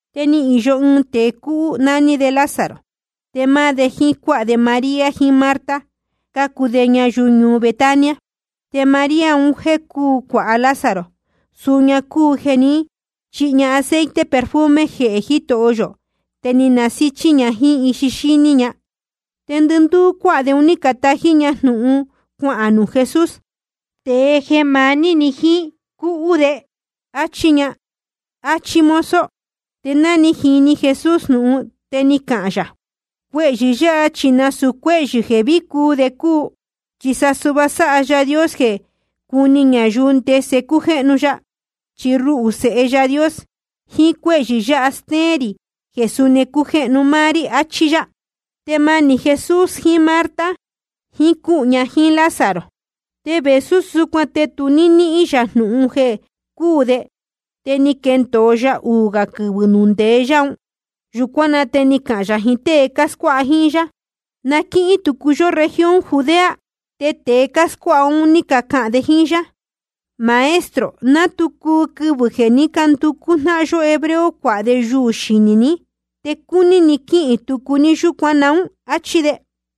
Te ni īyo ɨɨn tēe cúhú, nání de Lázaro. Te máá de jíín cuáha de María jiín Marta, cácuu de ñayuu ñuu Betania. Te María un jéē cúu cuāha Lázaro, suu ña cúu jeē ní chihi aceite perfume jehē Jitoho yō, te ni nasíchí ña jíín ixi xíní ña. Te ndɨndúú cuáha de un ní catají ña jnūhun cuahān nuū Jesús: Tēe jeē maní ni jíín, cúhú de, áchí ña, áchí mozo. Te ná ni jini Jesús jnūhun, te ni cahān yā: Cuehyɨ̄ yáha chi nasūu cuéhyɨ̄ jeē ví cuu de cúu. Chi sa suhva sáha Yaā Dios jeē cuni ñayuu ndese cújéhnu ya. Chi ruhū, Sēhe Yaā Dios, jiín cuéhyɨ̄ yáha te stéén rī jeē suni cújéhnu máá rí. Achí yá. Te manī Jesús jiín Marta jiín cúhū ña jíín Lázaro. Te vēsú súcuan te nuū ni níhīn yā jnūhun jeē cuhú de, te ni quendōo ya uū gā quɨvɨ̄ nuū ndeé yá un. Yūcuán na te ni cahān yā jiín tée cáscuáha jíín yá: Na quíhín tucu yó región Judea. Te tēe cáscuáha un ní cacahān de jíín yá: Maestro, ná tu cuu quɨvɨ̄ jeē ní canducú jnáhan yó hebreo cuāha de yuū xinī ní. ¿Te cúní ni quíhīn tucu ní yúcuan naún? Achí de.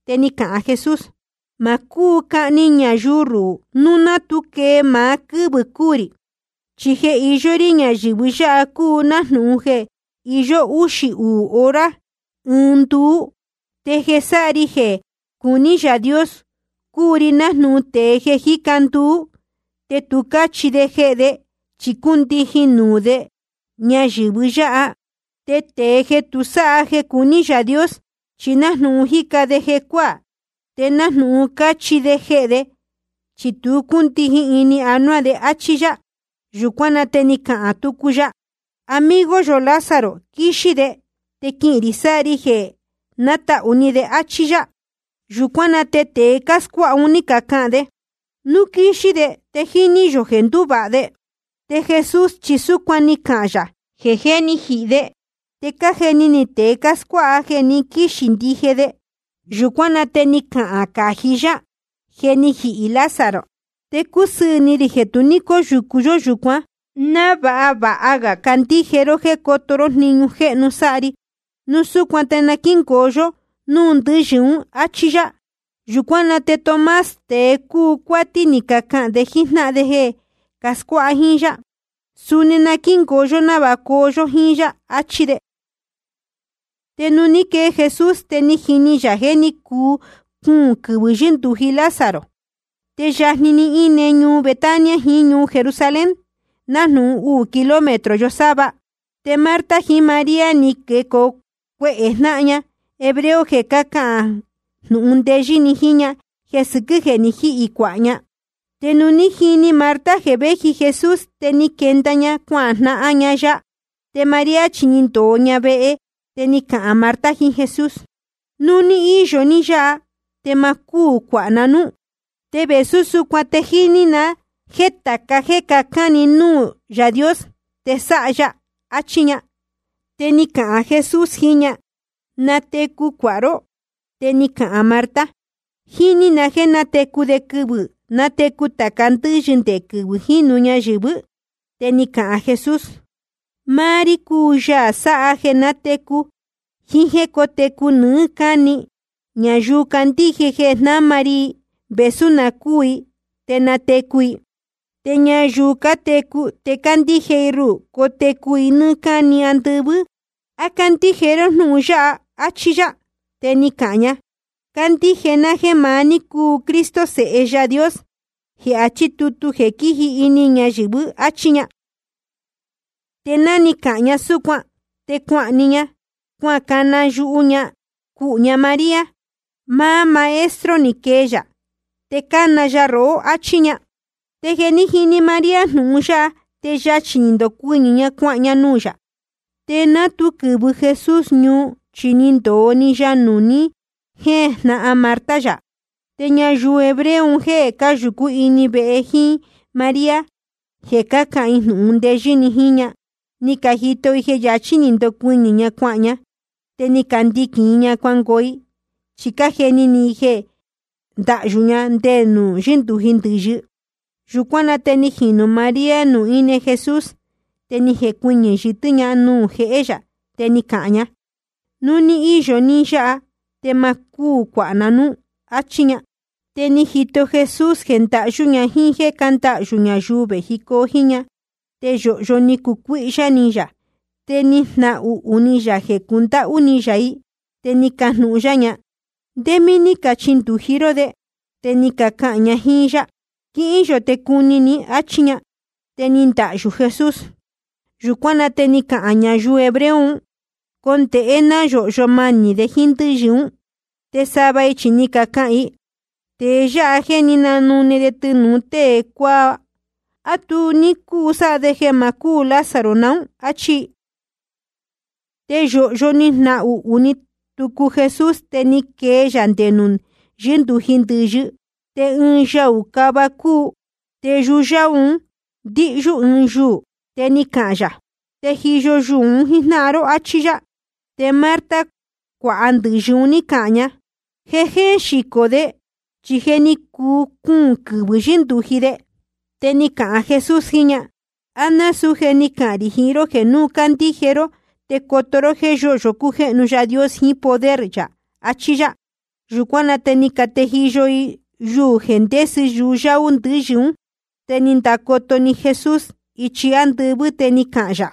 Te ni cahān Jesús: Ma cúu cahni ñayuu ruhū núu ná tu quee maá quɨ́vɨ̄ cuu rī. Chi jeē iyó rí ñayɨ̄vɨ yáha cúu nájnūhun jeē iyó úxī uū hora ɨɨn nduú. Te jeē sáha ri jeē cuní Yaā Dios, cúu ri nájnūhun tēe jeē jíca nduú, te tu cáchihi de jehē de, chi cúndijin nuū de ñayɨ̄vɨ yáha. Te tēe jeē tu sáha jeē cuní Yaā Dios, chi nájnūhun jíca de jecuáā, te nájnūhun cáchihi de jehē de, chi tu cúndijin ini anuá de. Achí yá. Yūcuán na te ni cahān tucu ya: Amigo yō Lázaro quíxí de, te quihīn rī sáha ri jeē nátahū ni de. Achí yá. Yūcuán na te tēe cáscuáha un ní cacahān de: Núu quíxí de te jíní yō jeē nduvāha de. Te Jesús chi súcuan ni cahān yā jeē jé ni jihī de. Te cájeni ni tēe cáscuáha jeē quixí ndije de. Yūcuán na te ni cahān cají yá: Je ni jihī Lázaro. Te cúsɨɨ̄ ni rī jeē tu ní cóyūcu yó yūcuán, návāha vāha ga candíje ró jéē coto ró jniñu jéhnu sáha ri. Núu súcuan te na quíngoo yó núū ndɨ́yɨ ún. Achí yá. Yūcuán na te Tomás, tēe cúu cuátí, ni cahān de jíín jnáhan de jeē cascuáha jíín yá: Suni na quíngoo yó návāha cuu yō jiín yá, achí de. Te nuū ní quee Jesús, te jíní yā jeē ní cuu cuūn quɨvɨ̄ yɨ́ndūji Lázaro. Te yajni‑ni íne ñuu Betania jiín ñuu Jerusalén, nájnūhun uū kilómetro yosáva. Te Marta jiín María, ni quecoo cuehē jnáhan ña hebreo jeē cahán i jnūhun ndeyɨ́ ni jiín ña jeē sɨquɨ́ jeē ni jíhī cuāha ña. Te nuū ní jini Marta jeē véji Jesús, te ni quenda ña cuajnahan ña ya. Te María chi ni ndōo ña vehe. Te ni cahān Marta jiín Jesús: Núu ní íyo ní yáha, te ma cúū cuāha ná núú. Te vēsú súcuan te jíní na jéē tāca jéē cacán ni núū Yaā Dios, te sáha ya, achí ña. Te ni cahān Jesús jiín ña: Natecu cuāha ró. Te ni cahān Marta: Jíní na jéē nátecu de quɨvɨ̄ nátecu tāca ndɨ́yɨ nde quɨvɨ̄ jínu ñayɨ̄vɨ́. Te ni cahān Jesús: Máá rí cúu Yaā sáha jeē nátecu jiín jéē cótecu nɨɨ́ cáni. Ñayuu candíje jeē jnáma ri i, vēsú na cúū i, te natecu i. Te ñayuu cátecu te cándíje i ruhū, cotecu i nɨ́ɨ́ cáni andɨvɨ́. ¿A cándíje ró jnúhun yáha? Achí yá. Te ni cahān ña: Cándíje ná jéē maá ní cúu Cristo, Sēhe Yaā Dios, jeē achí tutu jeē quíji ini ñayɨ̄vɨ, áchí ña. Te ná ni cahān ña súcuan, te cuahān‑ni ña, cuacana yuhu ña cuhū ña María: Máá Maestro ni quee yā, te cána ya rohó, áchí ña. Te jeē ní jini María jnūhun yáha, te yachī ni ndocuɨñɨ̄ ña, cuahān ña nuū yā. Te ná tu quɨ̄vɨ Jesús ñuu, chi ni ndōo‑ni ya nuū ni jéjnahan Marta yā. Te ñayuu hebreo un jéē cáyūcú ini vehe jíín María, jeē cácahān i jnūhun ndeyɨ́ ni jiín ña, ni cajito i jeē yachí ni ndocuɨñɨ̄ ña cuahān ña. Te ni candiquīn i ña cuangoo i, chi cájeni ni i jeē cuándahyū ña nde nuū yɨ́ndūji ndɨ̄yɨ. Yūcuán na te ni jinū María nuū íne Jesús, te ni jecuɨñɨ̄ yɨtɨ́ ña nuū jehé yā, te ni cahān ña: Núu ní íyo ní yáha, te ma cúū cuāha ná núú, áchí ña. Te ni jito Jesús jeē ndahyú ña jíín jéē cándahyū ñayuu vējicoo jíín ña. Te yōhyo ni nducuíhyá ni yā, te ni jnahuhū ni yā jeē cundáhú ni yā i. Te ni cajnūhun yá ña: ¿Ndé mí ní cachindūji ró de? Te ni cacahān ña jíín yá: Quíhín yō te cuni ní, áchí ña. Te ni ndahyū Jesús. Yūcuán na te ni cacahān ñayuu hebreo un: Condēhe náa yōhyo manī de jíín ndɨ́yɨ ún. Te sava i chi ni cacahān i: Tēe yáha jéē ní nanune de tɨnūu tée cuáá, ¿á tu ní cúu sáha de jeē ma cúū Lázaro nuú? áchí i. Te yōhyo ni jnahuhū ni tucu Jesús, te ni quee yā nde nuū yɨ́ndūji ndɨ̄yɨ. Te ɨɨn yaū cava cúu, te yuyáú un ndíhyú ɨɨn yuū. Te ni cahān yā: Tejiyo yuū un jíjnáhan ró, áchí yá. Te Marta, cuāha ndɨ̄yɨ un, ní cahān ña: Je jéén xicō de, chi je ni cuu cuūn quɨvɨ̄ yɨ́ndūji de. Te ni cahān Jesús jiín ña: ¿A násūú je ni cahān rī jiín ró jeē núu candíje ró te coto ró jéē yóhyo cújéhnu Yaā Dios jiín poder yā? achí yá. Yūcuán na te ni catejiyo i yuū jeē ndésɨ yuyáú ndɨ̄yɨ ún. Te ni ndacoto‑ni Jesús ichi ándɨvɨ́, te ni cahān yā: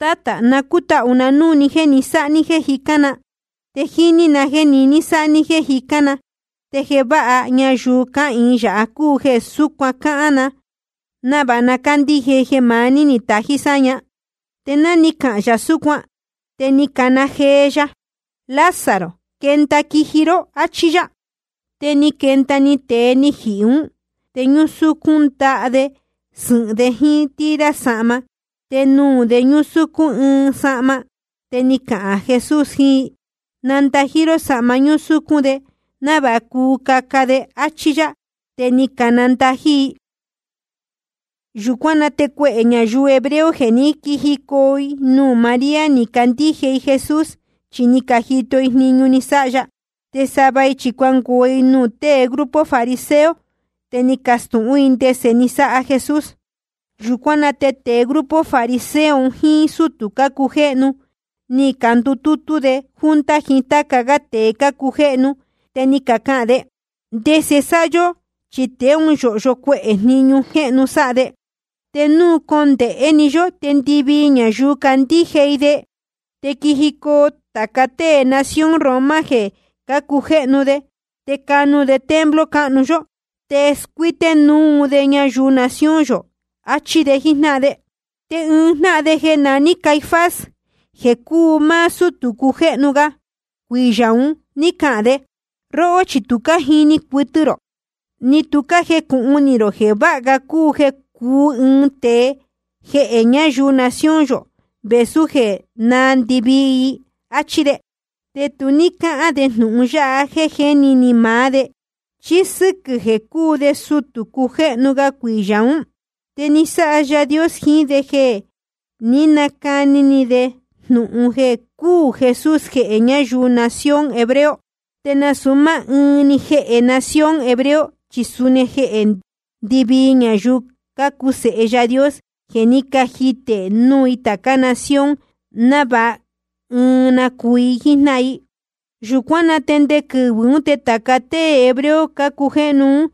Tátā, na cútahū na núū ni jéē sáha ní jéē jicán na. Te jíní na jéē niní sáha ní jéē jicán na. Te jeē váha ñayuu cáhīin yáha cúu jeē súcuan cáhán na, návāha na cándíje i jeē maá ní ni tají sáña. Te ná ni cahān yā súcuan, te ni cahān jee ya: Lázaro, quenda quiji ró, áchí yá. Te ni quenda‑ni tēe ni jihī ún, te ñúsúcún ndaha de sɨ̄hɨn de jíín tira sahma. Te nuū de ñúsúcún ɨɨn sahma. Te ni cahān Jesús jiín i: Nandají ró sahma ñúsúcún de, návāha cuu caca de, áchí yá. Te ni canandají i. Yūcuán na te cuehē ñayuu hebreo jeē ní quijicoo nuū María, ni cacandíje i Jesús, chi ni cajito i jniñu ni sáha ya. Te sava i chi cuangoo i nuū tée grupo fariseo, te ni cacastūhún i ndese ni sáha Jesús. Yūcuán na te tēe fariseo un jíín sútū cácujéhnu ni candutútú de junta jiín táca gá tēe cácujéhnu. Te ni cacahān de: ¿Ndese sáha yó? Chi tēe ún yōhyo cuehē jniñu jéhnu sáha de. Te núu condēhé‑ni yó, te ndɨvii ñayuu candíje i de. Te quijicoo tāca tée nación Roma jeē cácujéhnu, te canu de templo cáhnu yó, te scuíté núu de ñayuu nación yō, achí de jíjnáhan de. Te ɨɨn jnáhan de jeē naní Caifás, jeē cúu máá sútū cujéhnu ga cuiyā ún, ni cahān de: Róhó chi tu cájini cuɨtɨ rō, ni tu cájecūhun ni rō jeē váha ga jeē cúū ɨɨn tēe jehē ñáyuu nación yō vēsú jeē náā ndɨvii i, áchí de. Te tu ní cáhán de jnūhun yáha jéē jéni ni maá de. Chi sɨquɨ̄ jeē cúu de sutū cujéhnu ga cuiyā ún, te ni sáha Yaā Dios jiín de jeē ní nacani de jnūhun jeē cúū Jesús jehē ñáyuu nación hebreo. Te nasūu máá ɨɨn‑ni jehē nación hebreo, chi suni jehē ndɨvii ñayuu cácuu sēhe Yaā Dios jeē ní cajitē núu tācá nación, návāha ɨɨn na cuu i jíjnáhan i. Yūcuán na te nde quɨvɨ̄ ún te tāca tée hebreo cácujéhnu un,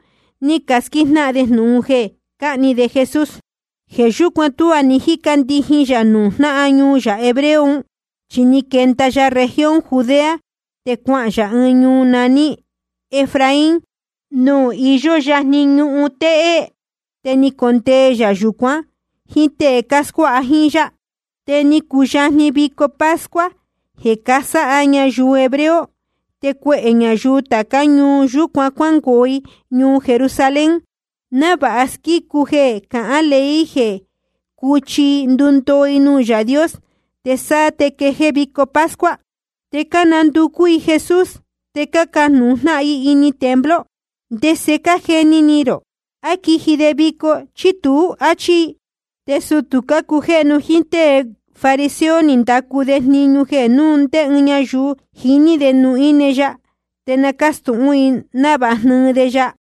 ní casquíjnáhan de jnūhun jeē cáhni de Jesús. Jeē yúcuan tuá ní jíca ndijin yā nuū jnáhan ñuu yā hebreo un, chi ni quenda ya región Judea, te cuahān yā ɨɨn ñuu naní Efraín, nuū iyó yajni ñuhun téhé. Te ni condee yā yūcuan jíín tée cáscuáha jíín yá. Te ni cuyajni vico pascua jeē cánasáha ñayuu hebreo. Te cuehē ñayuu tācá ñuu yūcuán cuángoo i ñuu Jerusalén, návāha squícu i jeē cahán ley jeē cúchi i ndundoo i nuū Yaā Dios, te sáá te quejéé vico pascua. Te cánanducú i Jesús, te cácajnūhun jnáhan i ini templo: ¿Ndese cájeni ni rō? ¿A quiji de vico, chí tuú? Achí i. Te sutū cácujéhnu jíín tée fariseo ni candacu de jniñu jeē núu ndé ɨɨn ñayuu jiní ndé nuū íne ya, te na cástūhún i, návāha jnɨɨ de ya.